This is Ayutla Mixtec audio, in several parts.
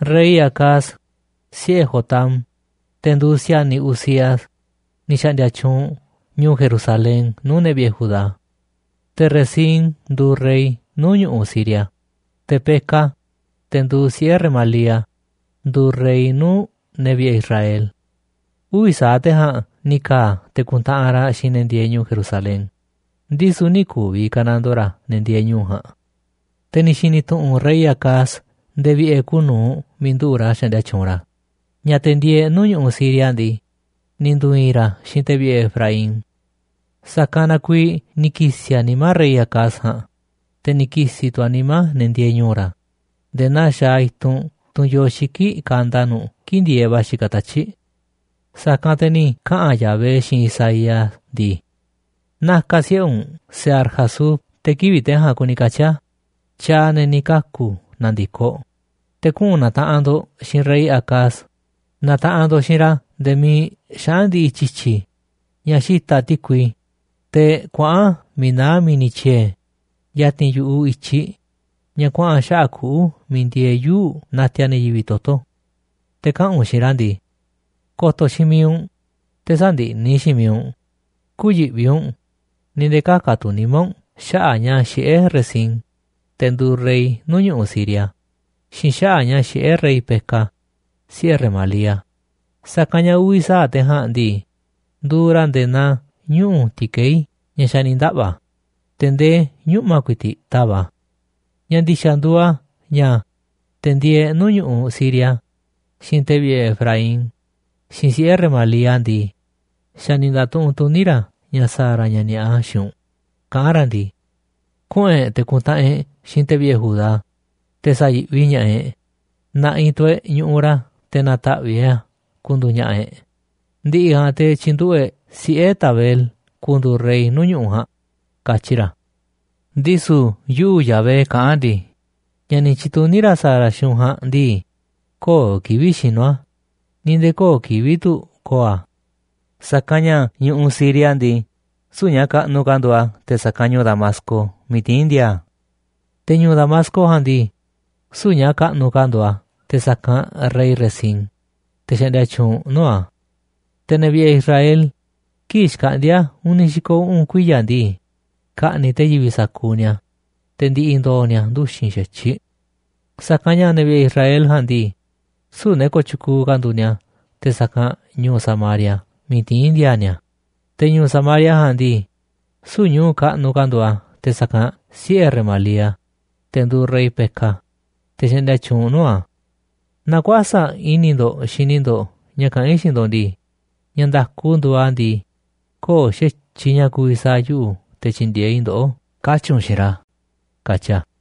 Rey Acaz, siꞌe̱ Jotam, te̱ nduuꞌ si̱a̱niꞌ Uzías, ni̱ xa̱ꞌndi̱a̱ tyuunꞌ ñu̱u̱ Jerusalén nuu̱ꞌ ne̱ vi̱ꞌe̱ Judá. Te̱ Rezín nduuꞌ rey nuu̱ꞌ ñu̱ꞌuꞌ Siria, te̱ Peka, te̱ nduuꞌ siꞌe̱ Remalía, nduuꞌ rey nuu̱ꞌ ne̱ vi̱ꞌe̱ Israel. Uvi̱ sa̱aꞌ te̱ ja̱a̱nꞌ ni̱ ka̱a̱ te̱ ku̱ntaꞌanꞌ ra̱ xiinꞌ ne̱ ndieeꞌ ñu̱u̱ Jerusalén, ndisu̱ nï̱ ku̱vi̱ ka̱nandoo ra̱ ne̱ ndieeꞌ ñu̱u̱ ja̱a̱nꞌ. Te̱ ni̱ xi̱ni̱ tu̱ꞌu̱n rey Acaz nde̱e̱ vi̱ꞌe̱ kuuꞌ nu̱uꞌ miiꞌ nduꞌu̱ꞌ ra̱ xaꞌndia tyuunꞌ ra̱ ña̱ te̱ ndieeꞌ nuu̱ꞌ ñu̱ꞌuꞌ Siria ndii, ni̱ ndu̱i̱i̱n ra̱ xiinꞌ te̱ vi̱ꞌe̱ Efraín. Sa̱kanꞌ na kuiiꞌ ni̱ ki̱si̱ a̱ nimá rey Acaz ja̱a̱nꞌ, te̱ ni̱ ki̱si̱ tu̱ a̱ nimá ne̱ ndieeꞌ ñu̱u̱ ra̱ nde̱e̱ naa xaaꞌ i̱tunꞌ tunꞌ yoo xiki̱ꞌ kanda nu̱ꞌ kii̱ꞌ ndi̱e̱eꞌ va̱ xikaꞌ tatyi̱ꞌ. Sa̱kanꞌ te̱ ni̱ kaꞌa̱n Yahvé xiinꞌ Isaías ndii: “Na̱ka̱ siꞌe̱ u̱nꞌ Sear-Jasub (te̱ kivi̱ꞌ te̱ ja̱a̱nꞌ kuni katyi̱ a̱, tyaaꞌ ne̱ ni̱ kaku̱ na̱ndi̱koꞌ), te̱ kuꞌu̱n na̱taꞌanꞌ ndo̱ꞌ xiinꞌ rey Acaz. Na̱taꞌanꞌ ndo̱ꞌ xiinꞌ ra̱ nde̱e̱ miiꞌ xaꞌa̱n ndi̱ꞌi̱ tyi̱tyi̱ ña̱ xita̱ꞌ ti̱kui, teꞌ kuaꞌa̱n miiꞌ naá mi̱ni̱ tyiee̱ ya̱ti̱n yu̱ꞌuꞌ i̱tyiꞌ ña̱ kuaꞌa̱n xaꞌa̱ꞌ kuꞌu̱ miiꞌ ndieeꞌ yuu̱ꞌ natiaꞌ ne̱ yivi̱ꞌ toto̱. Te̱ kaꞌa̱n u̱nꞌ xiinꞌ ra̱ ndii: Ko̱to̱ xiinꞌ mi̱iꞌ u̱nꞌ, te̱ sä̱ndiꞌni̱ xiinꞌ mi̱iꞌ u̱nꞌ, kü̱yi̱ꞌvi u̱nꞌ ni̱ nde̱e̱ kä̱ka̱ tu̱ nimá u̱nꞌ xaꞌa̱ꞌ ña̱ xiꞌé Rezín, te̱ nduuꞌ rey nuu̱ꞌ ñu̱ꞌuꞌ Siria, xiinꞌ xaꞌa̱ꞌ ña̱ xiꞌé rey Peka, siꞌe̱ Remalía, sa̱kanꞌ ña̱ uvi̱ sa̱aꞌ te̱ ja̱a̱nꞌ ndii, nduuꞌ ra̱ nde̱e̱ naa ñuꞌu̱ ti̱kei̱ ña̱ xa̱ ni̱ ndaꞌva̱, te̱ ndee ñuꞌma̱ ku̱i̱ti̱ꞌ tava̱ꞌ a̱. Ña̱ ndi̱xa̱ nduuꞌ a̱ ña̱, te̱ ndieeꞌ nuu̱ꞌ ñu̱ꞌuꞌ Siria, xiinꞌ te̱ vi̱ꞌe̱ Efraín, xiinꞌ siꞌe̱ Remalía ndii, xa̱ ni̱ nda̱tuꞌunꞌ tuní ra̱ ña̱ sa̱a̱ ra̱ ña̱ ni̱a̱ꞌa xiinꞌ u̱nꞌ, kaꞌán ra̱ ndii: Kuꞌu̱n e̱ꞌ te̱ ku̱ntaꞌanꞌ e̱ꞌ xiinꞌ te̱ vi̱ꞌe̱ Judá, te̱ sa̱yi̱ꞌvi ña̱ꞌaꞌ e̱ꞌ. Na̱ꞌi̱ tu̱ e̱ꞌ ñu̱ꞌuꞌ ra̱ te̱ na̱ta̱ꞌviꞌ e̱ꞌ a̱ ku̱ndu̱u̱ ña̱ꞌa̱ e̱ꞌ. Ndi̱ꞌi̱ ja̱a̱nꞌ, te̱ tyi̱nduꞌu̱ꞌ e̱ꞌ siꞌe̱ Tabeel ku̱ndu̱u̱ rey nuu̱ꞌ ñu̱ꞌuꞌ ja̱a̱nꞌ, katyi ra̱. ’Ndisu̱ yuꞌu̱, Yahvé, kaꞌán ndii: Ña̱ ni̱ tyi̱tuní ra̱ sa̱a̱ ra̱ xiinꞌ u̱nꞌ ja̱a̱nꞌ ndii, köo̱ꞌ kivi̱ꞌ xinu̱ a̱ ni̱ nde̱e̱ köo̱ꞌ kivi̱ꞌ tu̱ ko̱o̱ a̱. Sa̱kanꞌ ña̱ ñu̱ꞌuꞌ Siria ndii, süu̱ꞌ ña̱ kaꞌnuꞌ ka̱ nduuꞌ a̱ te̱ sa̱kanꞌ ñu̱u̱ Damasco miiꞌ tiín ndi̱a̱a̱ a̱, te̱ ñu̱u̱ Damasco ja̱a̱nꞌ ndii, süu̱ꞌ ña̱ kaꞌnuꞌ ka̱ nduuꞌ a̱ te̱ sa̱kanꞌ rey Rezín, te̱ xaꞌndia tyuunꞌ nuu̱ꞌ a̱. Te̱ ne̱ vi̱ꞌe̱ Israel, kii̱ꞌ xkaꞌndi̱a̱ uni̱ xi̱ko̱ uꞌu̱n kuiya̱ ndii, ka̱ꞌni̱ꞌ te̱ yivi̱ꞌ sa̱kuuꞌ ni̱a̱, te̱ ndi̱ꞌi̱ ndo̱o̱ ni̱a̱ nduxi̱n xa̱tyiꞌ. Sa̱kanꞌ ña̱ ne̱ vi̱ꞌe̱ Israel ja̱a̱nꞌ ndii, süu̱ꞌ ne̱ kooꞌ tyukuuꞌ ka̱ nduuꞌ ni̱a̱ te̱ sa̱kanꞌ ñu̱u̱ Samaria miiꞌ tiín ndi̱a̱a̱ ni̱a̱, te̱ ñu̱u̱ Samaria ja̱a̱nꞌ ndii, süu̱ꞌ ñu̱u̱ kaꞌnuꞌ ka̱ nduuꞌ a̱ te̱ sa̱kanꞌ siꞌe̱ Remalía, te̱ nduuꞌ rey Peka, te̱ xaꞌndia tyuunꞌ nuu̱ꞌ a̱. Naaꞌ kuäsa̱ꞌ i̱ni̱ ndo̱ꞌ xini ndo̱ꞌ ña̱ kaꞌán i̱ xiinꞌ ndo̱ꞌ ndii, ña̱ nda̱ku nduuꞌ a̱ ndii, köo̱ꞌ xa̱tyiꞌ ña̱ ku̱vi̱ sa̱a̱ yuꞌu̱ te̱ tyi̱ndi̱e̱eꞌ i̱ ndoꞌó, katyi̱ u̱nꞌ xiinꞌ ra̱”, katyi a̱.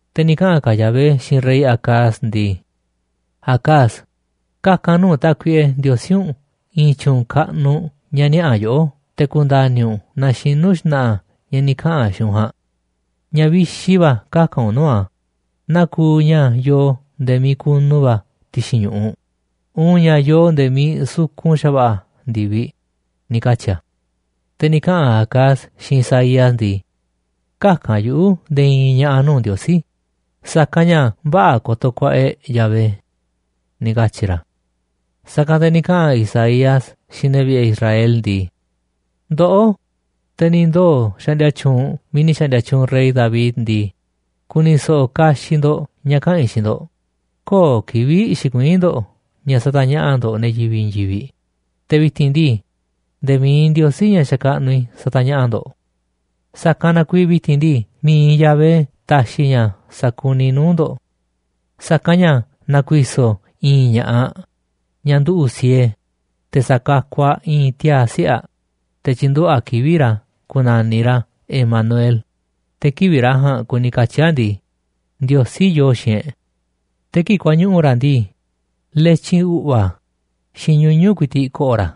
Te̱ ni̱ kaꞌa̱n ka̱ Yahvé xiinꞌ rey Acaz ndii: “Acaz, kaka̱n nuu̱ꞌ Tákuiꞌe Ndiosí u̱nꞌ i̱i̱n tyu̱u̱n kaꞌnuꞌ ña̱ niaꞌa̱ yoꞌó te̱ ku̱nda̱ni̱ u̱nꞌ naaꞌ xinu̱ xna̱ꞌa̱ ña̱ ni̱ kaꞌa̱n a̱ xiinꞌ u̱nꞌ ja̱a̱nꞌ. Ña̱ vixi va̱ kaka̱n u̱nꞌ nuu̱ꞌ a̱, naa kuuꞌ ña̱ yoo nde̱e̱ miiꞌ kunu va̱ ti̱xi̱n ñu̱ꞌuꞌ, uun ña̱ yoo nde̱e̱ miiꞌ sukun xa̱va̱ꞌa̱ ndi̱viꞌ”, ni̱ katyi̱ a̱. Te̱ ni̱ kaꞌa̱n Acaz xiinꞌ Isaías ndii: “Käka̱n yuꞌu̱ nde̱e̱ i̱i̱n ña̱ꞌa̱ nuu̱ꞌ Ndiosí, sa̱kanꞌ ña̱ vä̱ꞌa̱ ko̱to̱ ku̱a̱ꞌa̱ e̱ꞌ Yahvé”, ni̱ katyi̱ ra̱. Sa̱kanꞌ te̱ ni̱ kaꞌa̱n Isaías xiinꞌ ne̱ vi̱ꞌe̱ Israel ndii: “Ndoꞌó, te̱ ni̱ ndoo̱ xaꞌndia tyuunꞌ miiꞌ ni̱ xa̱ꞌndi̱a̱ tyuunꞌ rey David ndii, ku̱ni̱ so̱ꞌo̱ kaxiꞌ ndo̱ꞌ ña̱ kaꞌa̱n i̱ xiinꞌ ndo̱ꞌ. Köo̱ꞌ kivi̱ꞌ xikuiín ndo̱ꞌ ña̱ satañaꞌa̱ꞌ ndo̱ꞌ ne̱ yivi̱ꞌ i̱i̱n yivi̱ꞌ, te̱ vi̱ti̱n ndii, nde̱e̱ mi̱iꞌ Ndiosí, ña̱ xakaꞌnuꞌ i̱, satañaꞌa̱ꞌ ndo̱ꞌ. Sa̱kanꞌ na kuiiꞌ vi̱ti̱n ndii, mi̱iꞌ Yahvé ta̱xi̱ ña̱ sa̱kuniꞌ nuu̱ꞌ ndo̱ꞌ. Sa̱kanꞌ ña̱ na̱ku̱i̱so̱ i̱i̱n ña̱ꞌaꞌ ñaꞌ nduꞌu̱ꞌ siee, te̱ sa̱kakuꞌ aꞌ i̱i̱n tiaa̱ siꞌe̱ aꞌ, te̱ tyi̱nduꞌu̱ꞌ aꞌ kivi̱ꞌ ra̱ ku̱na̱niꞌ ra̱ Emanuel, te̱ kivi̱ꞌ ra̱ ja̱a̱nꞌ kuni katyi̱ a̱ ndii, Ndiosí yoo xiinꞌ e̱ꞌ. Te̱ kii̱ꞌ kuañuꞌu̱ ra̱ ndii, letyin u̱ꞌva̱ xiinꞌ ñuñu̱ꞌ ku̱i̱ti̱ꞌ ko̱ꞌo̱ ra̱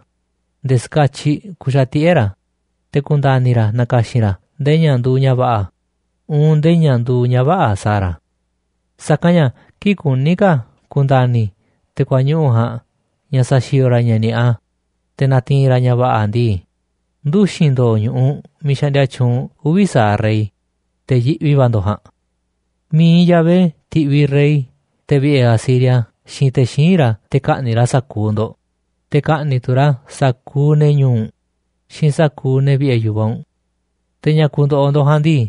nde̱e̱ ska̱tyiꞌ ku̱xa̱tiꞌe̱ ra̱, te̱ ku̱nda̱ni̱ ra̱ na̱ka̱xi̱n ra̱ ndee ña̱ nduuꞌ ña̱ va̱ꞌa̱ uun ndee ña̱ nduuꞌ ña̱ vä̱ꞌa̱ sa̱a̱ ra̱. Sa̱kanꞌ ña̱ kii̱ꞌ kuní ka̱ ku̱nda̱ni̱ te̱ kuañuꞌu̱ ja̱a̱nꞌ ña̱ sa̱xi̱o̱o̱ ra̱ ña̱ ni̱a̱ꞌa, te̱ na̱ti̱i̱n ra̱ ña̱ va̱ꞌa̱ ndii, nduxi̱n ndo̱o̱ ñu̱ꞌuꞌ miiꞌ xaꞌndia tyuunꞌ uvi̱ sa̱aꞌ rey, te̱ yiꞌvi va̱ ndo̱ꞌ ja̱a̱nꞌ. Mi̱iꞌ Yahvé ti̱ꞌviꞌ rey te̱ vi̱ꞌe̱ Asiria xiinꞌ te̱ xíinꞌ ra̱ te̱ ka̱ꞌni̱ꞌ ra̱ sa̱kuuꞌ ndo̱ꞌ, te̱ ka̱ꞌni̱ꞌ tu̱ ra̱ sa̱kuuꞌ ne̱ ñu̱u̱ u̱nꞌ xiinꞌ sa̱kuuꞌ ne̱ vi̱ꞌe̱ yu̱vaꞌ u̱nꞌ. Te̱ ña̱ ku̱ndo̱ꞌo̱ ndo̱ꞌ ja̱a̱nꞌ ndii,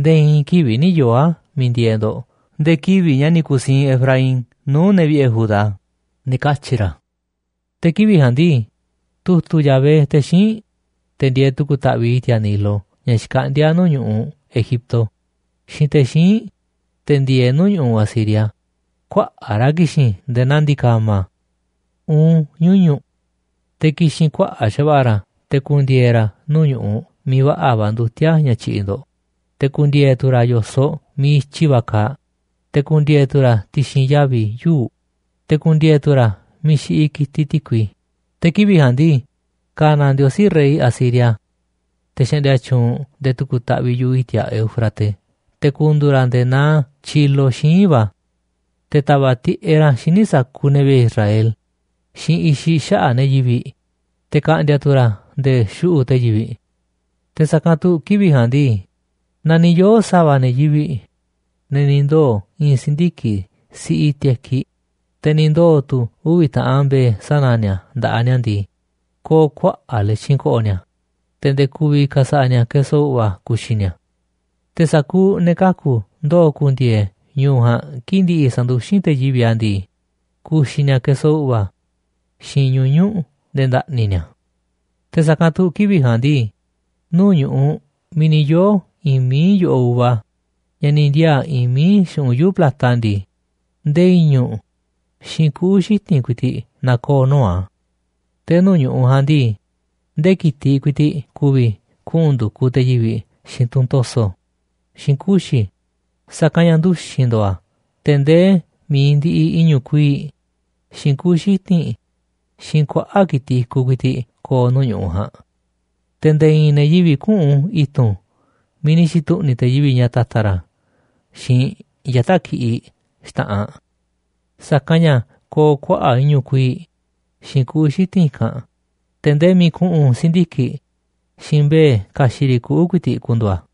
nde̱e̱ i̱i̱n kivi̱ꞌ nï̱ yoo̱ a̱ miiꞌ ndieeꞌ ndo̱ꞌ nde̱e̱ kivi̱ꞌ ña̱ ni̱ ku̱siinꞌ Efraín nuu̱ꞌ ne̱ vi̱ꞌe̱ Judá”, ni̱ katyi̱ ra̱. Te̱ kivi̱ꞌ ja̱a̱nꞌ ndii, tu̱tu̱ꞌ Yahvé te̱ xíinꞌ, te̱ ndieeꞌ tu̱ku̱ taꞌviꞌ i̱ti̱a̱ Nilo ña̱ xkaꞌndíá nuu̱ꞌ ñu̱ꞌuꞌ Egipto, xiinꞌ te̱ xíinꞌ, te̱ ndieeꞌ nuu̱ꞌ ñu̱ꞌuꞌ Asiria, kuaꞌa̱ꞌ ra̱ ki̱xi̱n nde̱e̱ naa ndi̱ka̱ma̱ uun ñuñu̱ꞌ. Te̱ ki̱xi̱n kuaꞌa̱ꞌ xa̱va̱ꞌa̱ ra̱ te̱ ku̱ndi̱e̱e̱ ra̱ nuu̱ꞌ ñu̱ꞌuꞌ miiꞌ va̱ꞌa̱ va̱ ndutíá ña̱ tyiꞌiꞌ ndo̱ꞌ, te̱ ku̱ndi̱e̱e̱ tu̱ ra̱ yo̱soꞌ miiꞌ i̱tyi va̱ kaaꞌ, te̱ ku̱ndi̱e̱e̱ tu̱ ra̱ ti̱xi̱n yavi̱ yuu̱ꞌ, te̱ ku̱ndi̱e̱e̱ tu̱ ra̱ miiꞌ xiꞌiꞌ ki̱tiꞌ ti̱kui. Te̱ kivi̱ꞌ ja̱a̱nꞌ ndii, ka̱na̱ Ndiosí rey Asiria, te̱ xaꞌndia tyuunꞌ nde̱e̱ tu̱ku̱ taꞌviꞌ yu̱ꞌuꞌ i̱ti̱a̱ Éufrates, te̱ ku̱ndu̱u̱ ra̱ nde̱e̱ naa tyilo xíinꞌ va̱, te̱ ta̱va̱ꞌ tiꞌeꞌ ra̱ xíniꞌ sa̱kuuꞌ ne̱ vi̱ꞌe̱ Israel xiinꞌ i̱xiꞌ xaꞌa̱ꞌ ne̱ yivi̱ꞌ, te̱ ka̱ꞌndi̱a̱ tu̱ ra̱ nde̱e̱ xuꞌu̱ꞌ te̱ yivi̱ꞌ. Te̱ sa̱kanꞌ tu̱ kivi̱ꞌ ja̱a̱nꞌ ndii, naaꞌ ni̱ yoo̱ sa̱va̱ ne̱ yivi̱ꞌ, ne̱ ni̱ ndoo̱ i̱i̱n si̱ndiki̱ꞌ siꞌi tekiꞌ, te̱ ni̱ ndoo̱ tu̱ uvi̱ taꞌan mbe̱e̱ sana̱ ni̱a̱ nda̱ꞌaꞌ ni̱a̱ ndii, ko̱o̱ kuaꞌa̱ꞌ letyin ko̱ꞌo̱ ni̱a̱, te̱ nde̱e̱ ku̱vi̱ ka̱sa̱ꞌa̱ ni̱a̱ keso u̱ꞌva̱ ku̱xi̱ ni̱a̱. Te̱ sa̱kuuꞌ ne̱ kaku̱ ndoo̱ ku̱ndi̱e̱e̱ ñu̱u̱ ja̱a̱nꞌ kii̱ꞌ ndi̱ꞌi̱ sa̱nduxín te̱ yivi̱ꞌ a̱ ndii, ku̱xi̱ ni̱a̱ keso u̱ꞌva̱ xiinꞌ ñuñu̱ꞌ nde̱e̱ nda̱ꞌni̱ ni̱a̱. Te̱ sa̱kanꞌ tu̱ kivi̱ꞌ ja̱a̱nꞌ ndii, nuu̱ꞌ ñu̱ꞌuꞌ miiꞌ ni̱ yoo̱ i̱i̱n mií yo̱ꞌoꞌ uva ña̱ ni̱ ndi̱a̱a̱ i̱i̱n mií xu̱ꞌunꞌ yuu̱ꞌ plata ndii, ndee i̱ñu̱ꞌ xiinꞌ kuꞌu̱ xiti̱nꞌ ku̱i̱ti̱ꞌ na̱koo̱ nuu̱ꞌ a̱. Te̱ nuu̱ꞌ ñu̱ꞌuꞌ ja̱a̱nꞌ ndii, ndee ki̱tiꞌ ku̱i̱ti̱ꞌ ku̱vi̱ kuꞌu̱n ndu̱kuꞌ te̱ yivi̱ꞌ xiinꞌ tunꞌ to̱so̱ xiinꞌ kuxi̱, sa̱kanꞌ ña̱ nduxi̱n ndo̱o̱ a̱ te̱ ndee mi̱iꞌ ndiꞌiꞌ i̱ñu̱ꞌ kuii̱ꞌ, xiinꞌ kuꞌu̱ xiti̱nꞌ, xiinꞌ kuaꞌa̱ꞌ ki̱tiꞌ i̱kuꞌ ku̱i̱ti̱ꞌ ko̱o̱ nuu̱ꞌ ñu̱ꞌuꞌ ja̱a̱nꞌ. Te̱ nde̱e̱ i̱i̱n ne̱ yivi̱ꞌ küꞌu̱n i̱tu̱n miiꞌ ni̱ xi̱tu̱ꞌni̱ te̱ yivi̱ꞌ ña̱ ta̱ta̱ ra̱ xiinꞌ yata̱ꞌ ki̱ꞌiꞌ xta̱ꞌanꞌ, sa̱kanꞌ ña̱ ko̱o̱ kuaꞌa̱ꞌ i̱ñu̱ꞌ kuii̱ꞌ xiinꞌ kuꞌu̱ xiti̱nꞌ i̱kanꞌ, te̱ ndee miiꞌ ku̱ꞌu̱n si̱ndiki̱ꞌ xiinꞌ mbe̱e̱ ka̱xi̱ꞌ riꞌ kuꞌu̱ ku̱i̱ti̱ꞌ ku̱ndu̱u̱ a̱.